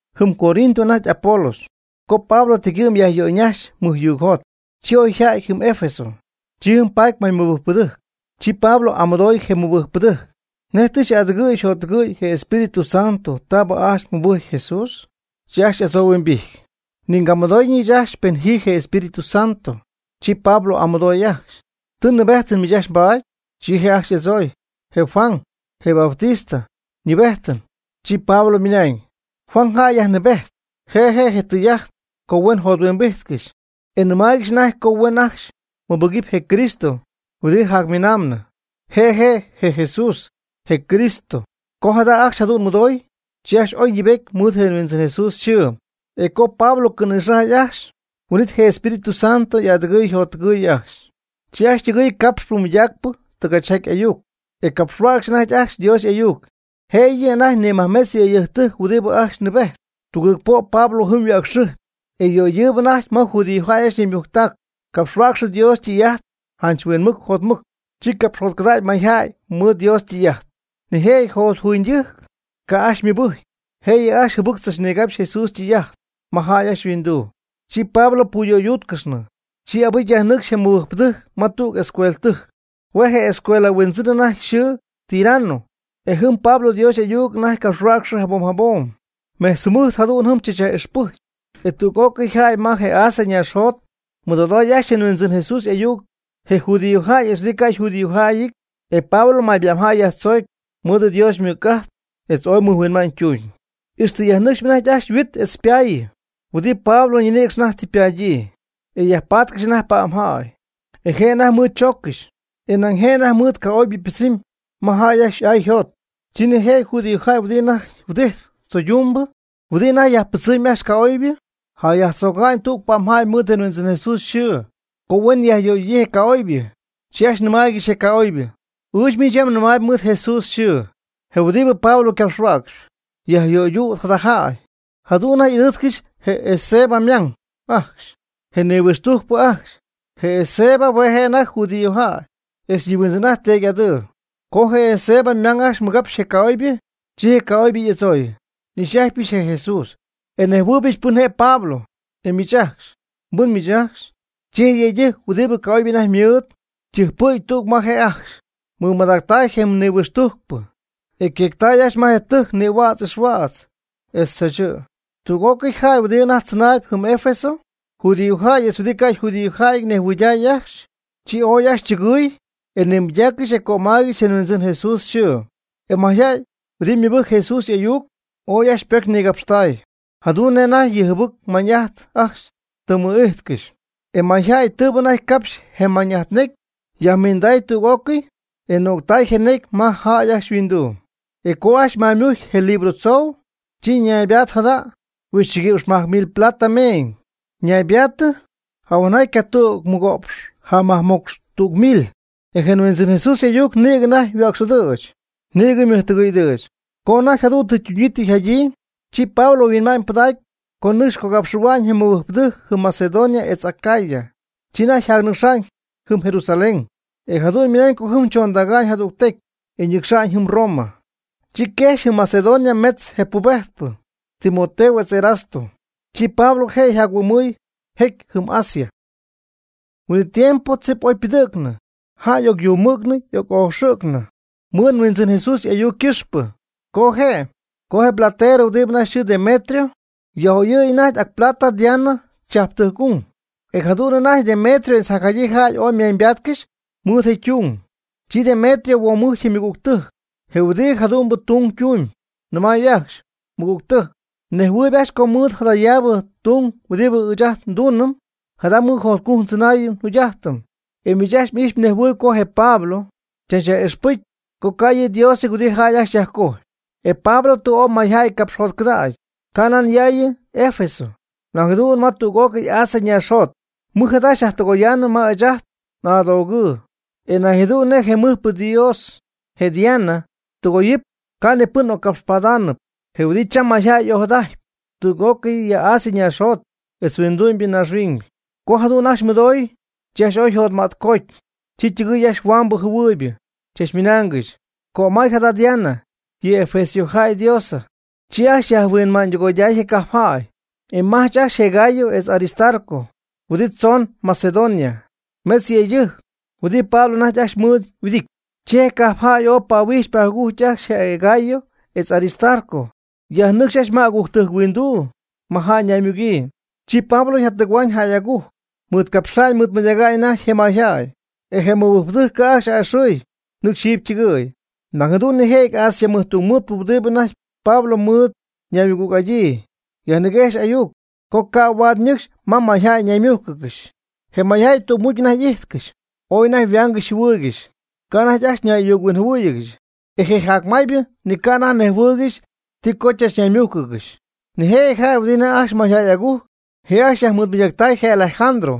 Jɨm Corinto anajty Apolos, co Pablo tegyɨ'm yajyöyñajxy mɨjyuugjot, chi oy yja'ty jɨm Efeso. Chi jɨm paty may mɨbɨjcpɨdɨjc. Chi Pablo y'amɨdooy je mɨbɨjcpɨdɨjc: ―¿Nej tɨ xy'adɨgɨɨy xyjottɨgɨɨy je Espíritu Santo taab ajcxy mmɨbɨjcy Jesús? Chi ajcxy y'adzohuimbijty: ―Ni ngamɨdooyñɨ ɨɨch ajcxy pen ji Espíritu Santo. Chi Pablo y'amɨdooy ajcxy: ―¿Ti nɨɨbejtɨn miich ajcxy mbaad? Chi je' ajcxy y'adzooy: ―Je Juan, je Bautista, ñɨɨbejtɨn. Chi Pablo ymɨnañ: ―Juan jäy yajnɨɨbejt je', je' je' je tɨy'ajt co huen jothuimbijtcɨxy. E nɨmaaygɨxy anajty co huen ajcxy mɨbɨgɨpy je Cristo huɨdi jacmiinamnɨ. Je' je' je Jesús, je Cristo. Co jada ajcxy jadu'n mɨdoy, chi ajcxy oy ñɨɨbety mɨɨd je Huindzɨn Jesús yxɨɨ. E co Pablo cɨ̈nïxajy ajcxy, huin'it je Espíritu Santo y'adɨgɨy yjottɨgɨy ajcxy. Chi ajcxy ytɨgɨɨy capxpɨ mɨydaacpɨ tɨgachyjaty ayuc, e capxhuäcxy anajty ajcxy Dios y'ayuc. Jëyɨ anajty nimajmetz yëydɨjctɨjc huɨdibɨ ajcxy nɨɨbejt. Tugɨɨg po' Pablo jɨm yhuäcxɨjpy, e yöydɨɨb anajty ma judíojäy ajcxy ñaymujctac capxhuäcxy Dios ytɨy'ajt janch huinmɨc jotmɨc. Chi capxjotcɨdägy mayjäy mɨɨd Dios ytɨy'ajt. Nijëjɨty jotjuuñydɨjc ca' ajcxy ymɨbɨjcy, jëyɨ ajcxy jɨbɨc tzachnigapxy Jesús ytɨy'ajt ma jäy ajcxy yhuinduu. Chi Pablo puyöydúutcɨxnɨ. Chi abɨcy yajnɨcxy je mɨbɨjcpɨdɨjc ma tüg escueltɨjc. Hue' je' je escuela huindzɨn anajty yxɨɨ Tirano, e jɨm Pablo Dios y'ayuc anajty capxhuäcxɨ jabom jabom. Mejtz jɨmɨjt jadu'n jɨm chachyaj'ixpɨjcy, e tüg'ócɨy jäy ma je Asia ñaaxjot ymɨdoday ajcxy je Huindzɨn Jesús y'ayuc, je judíojäy etz huɨdi ca' yjudíojäyɨty. E Pablo mayba'mjäy yajtzoocy mɨɨd Dios ymɨc'ajt etz ooy mɨjhuinma'ñ ytuñ. Ixtɨ yajnɨcxy anajty ajcxy yhuit etz ypaayɨ huɨdi Pablo ñinïcx anajty tɨ ypadyii, e yajpaatcɨxy anajty pa'mjäy, e je' anajty mɨɨd chooccɨxy, e nañ je' anajty mɨɨd ca'oybɨ ypɨdzɨmy ma jäy ajcxy y'ay yjot. Chi nijëjɨty judíojäy huɨdi anajty huɨdijtp tzoydumbɨ, huɨdibɨ anajty yajpɨdzɨmgɨxyp ajcxy ca'oybɨ, jayajtzögaañ tüg pa'mjäy mɨɨd je Huindzɨn Jesús yxɨɨ co huen yajyöydüdyii je ca'oybɨ. Chi ajcxy nɨmaygɨxy je ca'oybɨ: ―Ɨɨch miich yam nɨmaayb mɨɨd Jesús yxɨɨ, je huɨdi Pablo ycapxhuäcxp, yajyöydüt jada jäy. Jadu'n anajty y'ɨdɨɨtzcɨxy je Esceva ymang ajcxy, je nihuɨxtujcpɨ ajcxy. Je Esceva hue' je' anajty judíojäy etz nihuindzɨn'aty teedy'adɨɨ. Co je Esceva ymang ajcxy mɨgapx je ca'oybɨ, chi je ca'oybɨ y'adzooy: ―N'ix'atypɨch je Jesús, e nnejhuɨɨybɨch pɨn je' Pablo, e miich ajcxy, ¿mbɨn miich ajcxy? Chi je yëydɨjc huɨdi ca'oybɨ anajty mɨɨd, ytɨjcpɨ̈gy tüg ma je' ajcxy, ymɨmadactay je nihuixtujcpɨ, e yqueectay ajcxy ma je tɨjc nïhuädz ixhuädz etz tzaachɨ̈. Tüg'ócɨy jäy ajcxy huɨdi anajty tzɨnaayb jɨm Efeso, judíojäy etz huɨdi ca' yjudíojäyɨty nejhuɨyday ajcxy, chi ooy ajcxy chɨgɨy e nimɨydaaccɨxy e cömaaygɨxy je Huindzɨn Jesús yxɨɨ. E mayjäy huɨdi mɨbɨjc Jesús y'ayuc ooy ajcxy ypocy nigapxtay, jadu'n nej anajty yɨ jɨbɨc mañ'ajt ajcxy tɨ mɨ'ijtcɨxy. E mayjäy tɨɨbɨ anajty capxy je mañ'ajt necy yajminday tüg'ócɨy e no'ctay je necy ma jäy ajcxy yhuinduu. E co ajcxy maymujcy je libro tzou, chi naybaatɨ jada' huixchɨguïpx majc mil plata meeñ (moneda mexicana naybaatɨ jacnaxy jahueenjaty ycatüg mɨgo'px jamajcmocx tüg mil). E je Huindzɨn Jesús y'ayuc nïgɨ anajty yhuäcx'ɨdɨ̈ch, nïgɨ ymɨjtɨgɨy'ɨdɨ̈ch. Co anajty jadu'n tɨ ytuñyii tɨ yjadyii, chi Pablo yhuinma'ñypɨdacy co nɨcxy cogapxɨ̈hua'ñ je mɨbɨjcpɨdɨjc jɨm Macedonia etz Acaya. Chi anajty yjacnɨcxa'ñ Jerusalén e jadu'n ymɨnañ co jɨm chondäga'ñ jadügtecy e ñɨcxa'ñ jɨm Roma. Chi quejxy jɨm Macedonia mejtz je ypubejtpɨ, Timoteo etz Erasto. Chi Pablo je' yjac-huɨ'my jecy jɨm Asia. Huin'it tiempo tzip oy pɨdɨ̈cnɨ jäy y'ocyumɨ̈gnɨ y'oc'oxɨ̈gnɨ mɨɨd Huindzɨn Jesús y'ayuc ycɨxpɨ. Co je', je platerɨ huɨdi anajty yxɨɨ Demetrio, yaj'oyɨ̈y anajty ac plata Diana chajptɨjc'ung, e jadu'n anajty Demetrio etz jacjadyii jäy oy ymeeñybaatcɨxy mɨɨd je ytung. Chi Demetrio huomujcy ymɨgügtɨjc je huɨdi jadu'mbɨ tung tumb, nɨmay ajcxy: ―Mɨgügtɨ́jc, mnejhuɨɨyb ajcxy co mɨɨd jadayaabɨ tung huɨdi ɨɨch ajt nduunɨm, jada mɨɨd jotcujc ndzɨnaayɨm njugy'ajtɨm. E miich ajcxy m'ijxpy mnejhuɨɨyb co je Pablo chach yaj'ixpɨjcy co ca' yɨ' diosɨty huɨdi jäy ajcxy yajcojpy. E Pablo tɨ ooy mayjäy capxjotcɨdägy, canan yaayɨ Efeso, nañ jadu'n ma tüg'ócɨy Asia naaxjot. Mɨj jada xyajtɨgoyaanɨm ma ɨɨch ajt n'adogɨɨ e nañ jadu'n je mɨjpɨ dios, je Diana, ytɨgoyɨpy, ca' ni pɨn occapxpaatnɨpy, je huɨdi cham mayjäy y'ojadajtpy tüg'ócɨy ya Asia ñaaxjot etz huindu'my naaxhuiñybɨ. Co jadu'n ajcxy mɨdoy, chi ajcxy ooy yjotmätcooty, chi ytɨgɨɨy ajcxy huambɨ jɨhuɨɨyb, chachmɨnaangɨxy: ―¡Cömay jada Diana, yɨ efesiojäy ydiosa! Chi ajcxy yajhuinmäñydɨgoyday je cajp jäy e majch ajcxy je Gayo etz Aristarco, huɨdi tzoon Macedonia, metz yëydɨjc, huɨdi Pablo anajty ajcxy ymɨɨd huɨdijtpy. Chi je cajpjäy ooy pahuijch pajugujcy ajcxy je Gayo etz Aristarco, yajnɨcxy ajcxy ma agujctɨjc huinduu ma jäy ñaymugyii. Chi Pablo yjatɨgɨ̈huaañ jäy agujc, mɨɨdcapxa'ñ mɨɨdmɨydäga'ñ anajty je mayjäy. E je mɨbɨjcpɨdɨjc ca' ajcxy a'ɨxɨɨy nɨcxy jiiby ytɨgɨ̈y. Nañ jadu'n nijëjɨty Asia mɨjtungmɨɨdpɨ huɨdi anajty Pablo mɨɨd ñaymɨgüg'adyii, yajniguejxy ayuc, co ca' huaad ñɨcxy ma jäy ñaymújcɨgɨxy. Je mayjäy tügmucy anajty íjtcɨxy, ooy anajty yhuaangɨxy yjɨhuɨɨygɨxy, ca' anajty ajcxy ñay'ayuc-huinjɨhuɨɨygɨxy. E je jacmaaybɨ ni ca' anajty nejhuɨɨygɨxy ti co chachnaymújcɨgɨxy. Nijëjɨty jäy huɨdibɨ anajty ajcxy mayjäy agujc, je ajcxy yajmɨɨdmɨydactay je Alejandro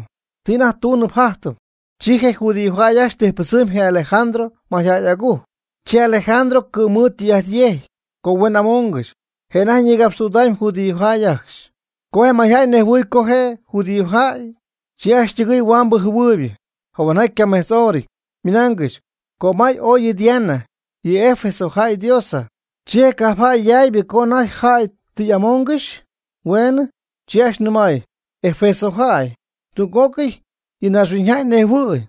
ti anajty tuunɨp jajtɨp. Chi je judío jäy ajcxy tijpɨdzɨmy je Alejandro ma mayjäy agujc. Chi Alejandro cɨ̈mɨɨd tɨy'ajt yejcy co huen amongɨxy. Je' anajty ñïgapxtüdamy judíojäy ajcxy. Co je mayjäy nejhuɨy co je' je' yjudíojäyɨty, chi ajcxy ytɨgɨɨy huaambɨ jɨhuɨɨybɨ jahuenjaty ycamejtzhorɨty, ymɨnaangɨxy: ―¡Cömay ooy yɨ Diana, yɨ Efeso jäy ydiosa! Chi je cajp jaaybɨ co anajty je jäy tɨ yaj'amoongɨxy hueenɨ, chi ajcxy nɨmay: ―Efeso jäy, tüg'ócɨy yɨ naaxhuiñyjäy nejhuɨ̈y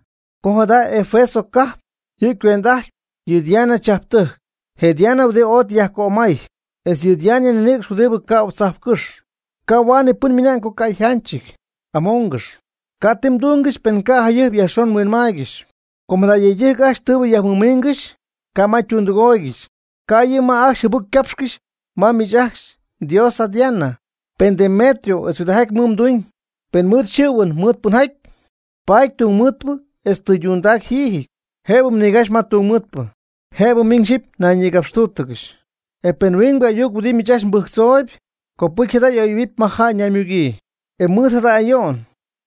co jada Efeso cajp yɨ' cuend'ajtp yɨ Diana chajptɨjc, je' Diana huɨdi ooy tɨ yajcömay, etz yɨ Diana ñinïcx huɨdi cä'u tzajpcɨ́xy. Ca' huaad ni pɨn ymɨna'ñ co ca' yjánchɨty. Amongɨx, ca' ti mdúngɨxɨpy pen ca' jayɨjp yajxon mhuinmaaygɨxy. Com jada yëydɨjc ajcxy tɨɨbɨ myajmiingɨxy, ca' ma ytundɨgooygɨxy, ca' yɨ' ma ajcxy jɨbɨc capxcɨxy ma miich ajcxy mdiosa Diana. Pen Demetrio etz huɨdijaty mɨɨd ytuñ pen ymɨɨd xɨ̈huɨn mɨɨd pɨnjaty, paady tungmɨɨdpɨ etz tɨydundac jiijɨty. Jëbɨ nigapxy ma tungmɨɨdpɨ, jëbɨ miñ xyipy ñayñïgapxtúutɨgɨxy. E pen huingbɨ ayuc huɨdi miich ajcxy mbɨjctzooyb, copɨty jada y'oyɨ̈huɨpy ma jäy naymugyii. Ymɨɨd jada ayo'n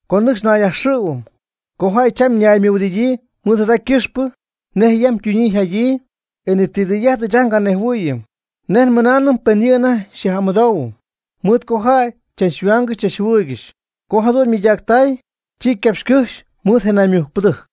co nɨcxy nayyajxɨ̈huɨm co jäy cham ñaymɨhuɨdidyii mɨɨd jada ycɨxpɨ nej yam ytunyii yjadyii e ni ti tɨy'ajt ɨɨch ajt nganejhuɨɨyɨm nej nmɨnaanɨm pen ji anajty xyaj'amɨdoohuɨm mɨɨd co jäy cham chachhuaangɨxy chachjɨhuɨɨygɨxy. Co jadu'n mɨydactay, chi ycapxycɨjxy mɨɨd je naymujcpɨdɨjc.